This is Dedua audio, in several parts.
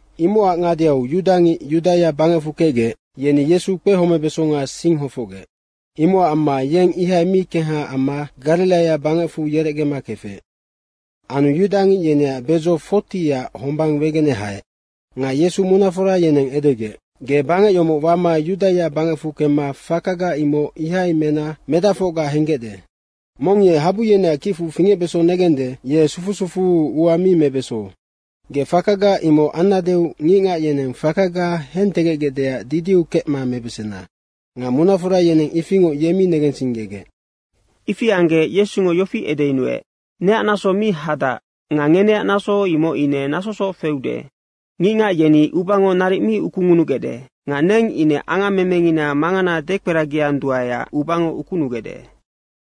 Imocac ngadeau yudangic Yudaia bangecfu kecgec, yeni Yesu kpehomebesonga sing hofocgec. Imocac amma yeng ihai mi kengha amma Gariraia bangecfu yerecgema kefec. Anu yudangic yeneac bedzo 40ac hombang wegene haec. Nga Yesu munafora yeneng edegec, “Ge bangec yomoc wama Yudaia bangecfu kemma fakaga imoc ihai mena medacfocga henggecde. Mong ye habu yeneac kicfu fingecbeso negende, ye sufu sufuu ua mi mebeso. Ge fakaga imoc annadeu ngicngac yeneng fakaga hentegecgecdeac didiu kecma mebesena.” Nga munafora yeneng ifingoc ye mi negensinggegec. Ifi anggec Yesungo yofi edeyunuec, “Neac naso mi hadac nga ngeneac naso, imoc ine nasosoc feude. Ngicngac yeni ubango naric mi ukungunugecde. Nga neng ine angammemengina mangana dekperagianduaeac ubango ukunugec.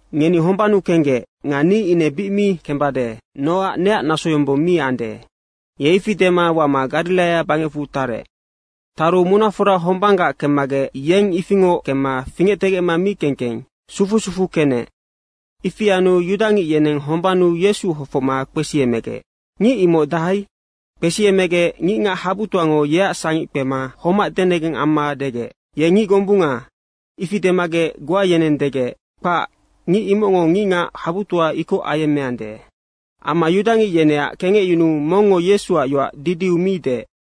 Ngeni hombannu kenggec nga ni ine bic mi kembade nocac neac nasoyombong mi ande.” Ye ifi dema wama Gariraia bangecfu tarec. Taru munafora hombanggac kemmagec ye ifingoc kemma fingectegecma mi keng keng sufu sufuu kenec. Ifi anu yudangic yeneng hombannu Yesu hofocma kpesiemegec, “Ngic imoc dahai?” Kpesiemegec ngicngac habutoango yeac sangic kpema homac denegeng amma degec, “Ye ngic gombunga.” ifi demagec goa yeneng degec, “Kpac, ngic imocngo ngicngac habutoa ikoc ayemmeande.” Amma yudangic yeneac kengecyunuu mongngo Yesuac yoac didiu mi deec.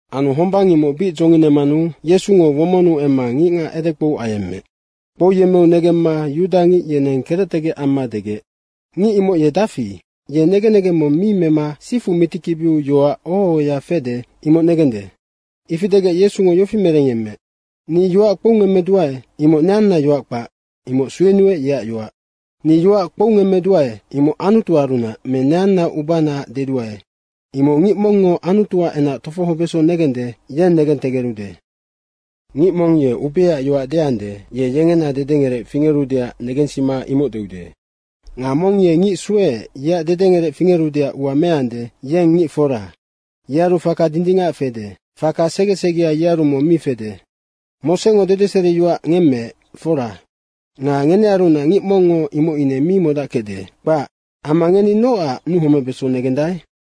Anu hombang imoc bic dzonginemanu Yesungo womonnu emma ngicngac edekpou ayemmeec. Kpouyemmeu negemma yudangic yeneng kerectegec amma degec, “Ngic imoc ye dafi, ye negen negeng mong mi mema sifu mitikibiu yoac oho ohoya fede, imoc negende.” Ifi degec Yesungo yofi merengyemmeec, “Ni yoac kpoungemmeduae, imoc neanna yoac kpac. Imoc suenuec, yeac yoac. Ni yoac kpoungemmeduae, imoc Anutuarunac me neanna ubanaac deduae, imoc ngic mongngo Anutuac enac tofohobeso negende, yeng negentegerude. Ngic mong ye ubeaac yoac deande, ye yengena dedengerec fingerudeac negensima imoc deude. Nga mong ye ngic sueec, yeac dedengerec fingerudeac ua meande, yeng ngic fora, yearu faka dindingac fede. Faka segesegea yearu mong mi fede. Mosengo dedeseriyoac ngemmeec, fora. Nga ngenearunac ngic mongngo imoc ine mi modackecde, kpac. Amma ngeni nocac nuhomebeso negendae?”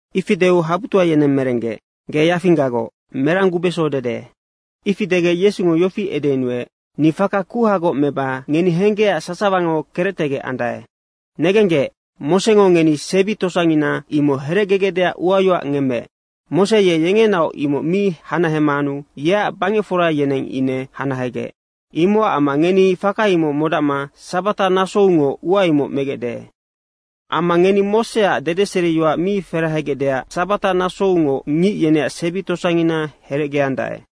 Ifi deu habutoa yeneng merenggec, “Ge yafinggagoc. Merang gubeso dede?” Ifi degec Yesungo yofi edeyunuec, “Ni faka kuhagoc meba ngeni henggecac sasawango kerectegec andae. Negenggec, Mosengo ngeni sebi tosangina, imoc herecgegecdeac uayoac ngemmeec. Mose ye yengenaoc imoc mi hanahemanu yeac bangecfora yeneng ine hanahegec. Imocac amma ngeni faka imoc modacma sabata nasoungoc ua imoc megecde. Amma ngeni Moseac dedeseriyoac mi ferahegecdeac sabata nasoungoc ngic yeneac sebi tosangina herecgeandae.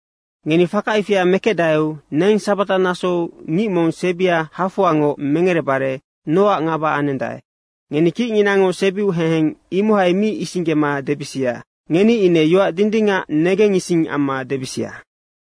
Ngeni faka ifia mekecdaeu neng sabata nasou ngic mong sebia hafoangoc mengerebare nocac ngaba anendae? Ngeni kicnginango sebiu heheng imohai mi isinggema debisia. Ngeni ine yoac dindingac negengising amma debisia.”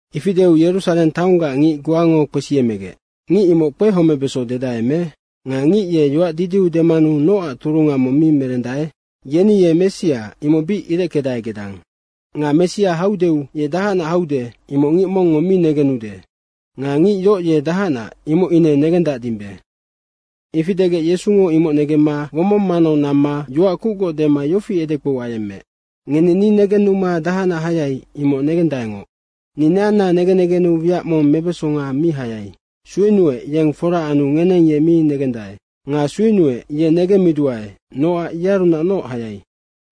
Ifi deu Yerusareng taonggac ngic goango kpesiemegec, “Ngic imoc kpehomebeso dedae me? Nga ngic ye yoac didiu demanu nocac turunga mong mi merendae? Yeni ye Messia, imoc bic ireckedae gedang. Nga Messia haudeu ye dahacnac haude imoc ngic mongngo mi negenude nga ngic yoc ye dahacnac, imoc ine negendacdimbe.” Ifi degec Yesungo imoc negemma womong manau namma yoac kucgoc dema yofi edekpou ayemmeec, “Ngeni ni negennuma dahacnac hayai, imoc negendaengoc. Ni neanna negen negennu wiac mong mebesonga mi hayai. Suenuec, yeng fora anu ngeneng ye mi negendae. Nga suenuec, ye negemmiduae, nocac yearunacnoc hayai.”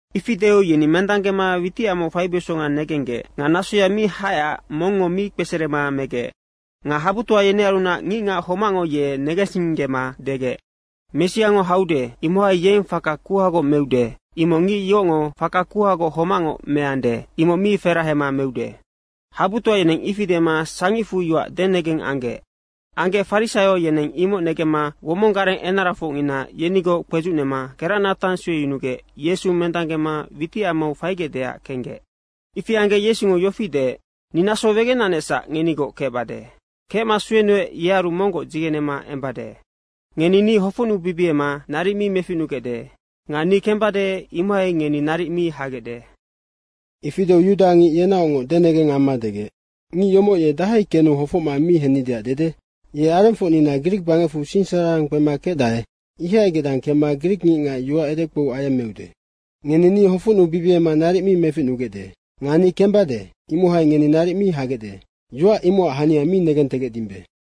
Ifi deu yeni mendanggema witicamau faibesonga negenggec. Nga nasoya mi haecac mongngo mi kpeserema megec. Nga habutoa yenearunac ngicngac homacngo ye negensinggema degec, “Messiango haude, imohai yeng faka kuhagoc meude, imoc ngic yocngo faka kuhagoc homacngoc meande, imoc mi ferahema meude.” Habutoa yeneng ifi dema sangicfu yoac denengeng anggec. Anggec farisaio yeneng imoc negemma womong gareng enarafocngina yenigoc kpedzucnema keracnatang sueyunugec Yesu mendanggema witicamau faigecdeac kenggec. Ifi anggec Yesungo yofi deec, “Ni naso wegenanecsac ngenigoc kecbade. Kecma suenuec, yearu monggoc dzigenema embade. Ngeni ni hofocnubibiema naric mi meficnugecde nga ni kembade, imohai ngeni naric mi hagecde.” Ifi deu yudangic yenaocngoc denegeng amma degec, “Ngic yomoc ye dahai kenu hofocma mi hennideac dede. Ye arengfocnina grik bangecfu sinsararang kpema kecdae, ihai gedang kemma grikngicngac yoac edekpou ayemmeude. Ngeni ni hofocnubibiema naric mi meficnugecde nga ni kembade, imohai ngeni naric mi hagecde. Yoac imocac hania mi negentegecdimbe.”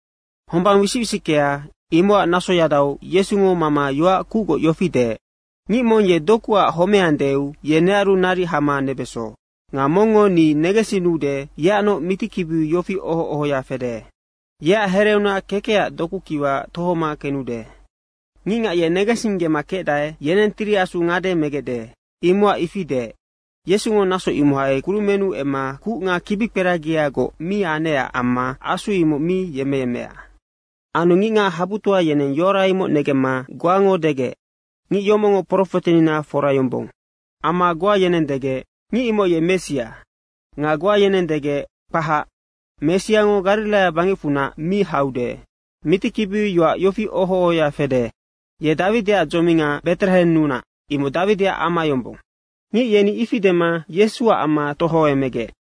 Hombang wisic wisickea, imocac nasoyadau Yesungo mama yoac kucgoc yofi deec, “Ngic mong ye dokuac homeandeu ye nearu naric hama nebeso. Nga mongngo ni negensinnude, yeacnoc mitikibiu yofi oho ohoya fede, ‘Yeac hereunac kekecac dokukiwa tohoma kenude.’” Ngicngac ye negensinggema kecdae, yeneng Tiri Asu ngade megecde, imocac ifi deec. Yesungo naso imohai kurumennu emma kuc nga kibikperagiagoc mi anecac amma Asu imoc mi yemmeyemmea. Anu ngicngac habutoa yeneng yoara imoc negemma goango degec, “Ngic yomocngo profetenina fora yombong.” Amma goa yeneng degec, “Ngic imoc ye Messia.” nga goa yeneng degec, “Kpahac, Messiango Gariraia bangecfunac mi haude.” Mitikibiu yoac yofi oho ohoya fede, “Ye Dawidiac dzominga Beterehennunac, imoc Dawidiac ama yombong.” ngic yeni ifi dema Yesuac amma tohoemmegec.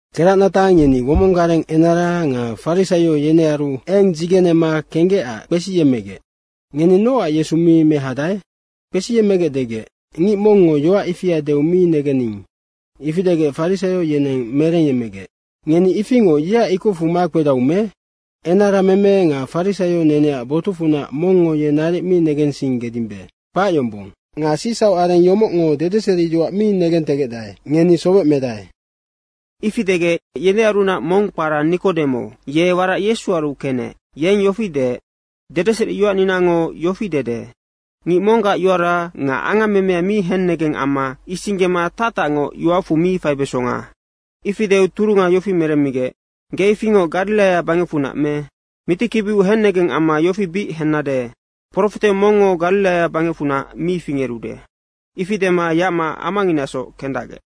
Keracnatang yeni womong gareng enara nga farisaio yenearu eng dzigenema kenggecac kpesiyemmegec, “Ngeni nocac Yesu mi mehadae?” Kpesiyemmegec degec, “Ngic mongngo yoac ifia deu mi negenning.” Ifi degec farisaio yeneng merengyemmegec, “Ngeni ifingoc yeac ikocfu makpedau me? Enarameme nga farisaio neneac botucfunac mongngo ye naric mi negensinggedimbe, kpac yombong. Nga sicsauc areng yomocngo dedeseriyoac mi negentegecdae, ngeni sowec medae.” Ifi degec, yenearunac mong kpara Nikodemo, ye warac Yesuaru kenec, yeng yofi deec, “Dedeseriyoacninango yofi dede, ‘Ngic monggac yoara nga angammemea mi hennegeng amma isinggema tactacngoc yoacfu mi faibesonga.’” Ifi deu turunga yofi meremmigec, “Ge ifingoc Gariraia bangecfunac me? Mitikibiu hennegeng amma yofi bic hennade, profete mongngo Gariraia bangecfunac mi fingerude.” Ifi dema yacma amanginasoc kendacgec.